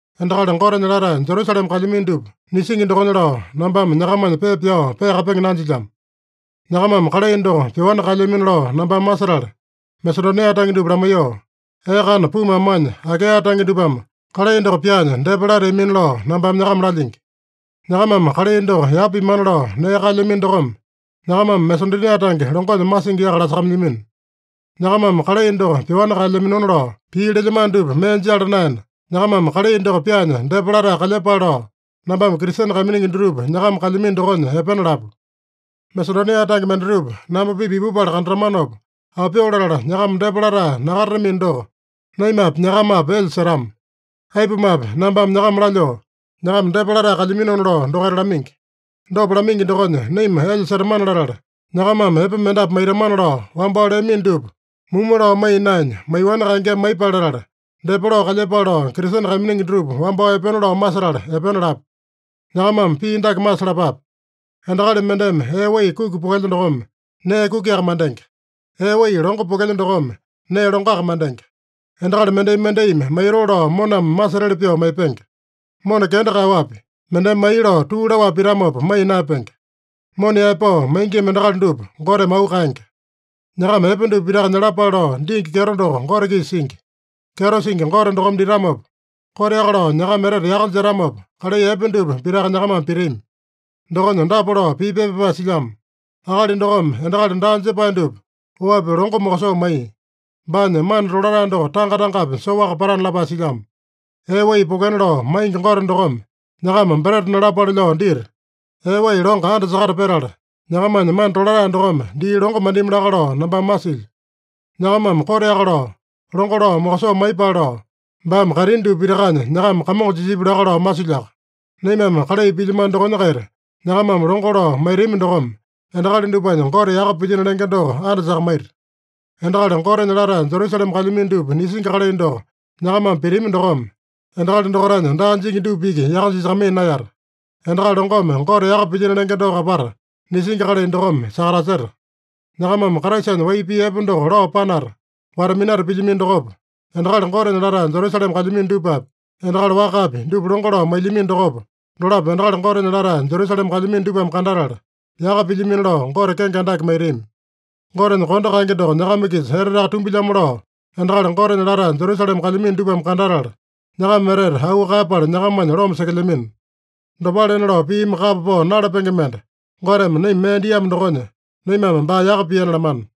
Endakali Gotenya latae Jerusalema kalyamino dupa nisingi dokonya lao, nambame nyakamanya pepa pyao peakapenge nanjilyamo. Nyakamame kalai doko pyoani kaelyamino lao nambame masetala, Masedonia tange dupa lamaiyoo, “Ee kana pumu amanya Akaeya tange dupame kalai doko pyaanya depa lateamina” lao nambame nyakama lalyingi. Nyakamame kalai doko yapa pimana lao nee kaelyamino dokome, nyakamame Masedonia tange longonya masingi yaka lasakamailyamino. Nyakamame kalai doko pyoani kaelyaminona lao pii lelyamano dupa mee jala naena, nyakamame kalai doko pyaanya depa latae kalyepale lao, nambame Kristene kaiminingi dutupa nyakama kalyamino dokonya epena lapu. Masedonia tange mendatupa namba-pipa ipupala kandatamanopa, aopyoo latala nyakama depa latae nakatatamino doko, naimapi, nyakamapi, elya setama. Aipumape, nambame nyakama lalyoo, nyakama depa latae kalyaminona lao dokaita lamaingi. Dopa lamaingi dokonya naima elya setamane-latala, nyakamame epe mendapu maitamana lao wambao leamino dupa mumu lao maiya naenya, maiyoani kaengeme maiyepale latala, depa lao kalyepale lao Kristene kaiminingi dutupa wambao epena lao masetala epena lapu. Nyakamame pii dake masalapape: Endakali mendeme ee wai kuki pokelya dokome, nee kukiaka mandenge. Ee wai longo pokelya dokome, nee longoaka mandenge. Endakali mendai-mendaimi maitoo lao moname masetali pyoo maipenge. Mona kenda kaeyaowapi, mendeme mai lao tuu laowapi pitamopa maiya naeyapenge. Mona yaepao maingima endakali dupa Goteme auu kaenge. Nyakama epe dupa pitaka nyalapale lao dingi kyeto doko Gote-kisa singi. Kyeto singi Gote dokome ditamopa, koteaka lao nyakama etete yaka jetamopa, kalai epe dupa pitaka nyakamame pitami. Dokonya dapa lao pii pepa pyapae silyamo: “Akali dokome endakali daa jepae dupa oapi longo mokosoo maiya. Baanya mana tolatae doko tanga-tangapi soaka patana” lapae silyamo. Ee wai pokena lao maingi Gote dokome nyakama breta nalapale lao dita, ee wai longo andasakata petala, nyakamanya mana tolatae dokome dii longo mandimi laka lao nambame masilyo. Nyakamame koteaka lao longo lao mokosoo maiyepale lao, baame kaitini dupa pitakanya nyakama kamongo jisipya laka lao masilyoaka. Naimame kalai pilyamano dokonya-kaita nyakamame longo lao maitami dokome, endakali dupanya Gote yaka pilyino lenge doko andasakamaita. Endakali Gotenya latae Jerusalema kalyamino dupa nisingi kalai doko nyakamame pitami dokome, endakali dokaitanya daa jingi dupa iki yaka jisakamaiya naeyata. Endakali longome Gote yaka pilyino lenge doko apata nisingi kalai dokome sakataseta. Nyakamame Kraisanya wai pii epe doko lao panata, wata-minata pilyamino dokopa, endakali Gotenya latae Jerusalema kalyamino dupapi, endakali wakapi, dupa longo lao mailyamino dokopa, dolapo endakali Gotenya latae Jerusalema kalyamino dupame kandatala, yaka pilyamino lao Gote kenge andake maitami. Gotenya kondo kaenge doko nyakama-kisa eteteaka tumbilyamo lao, endakali Gotenya latae Jerusalema kalyamino dupame kandatala, nyakama etete auu kaeyapala nyakamanya loma sekelyamino. Dopalena lao piimi kapa pao nalapenge mende Goteme naima mee diamo dokonya, naimame baa yaka piana lamana.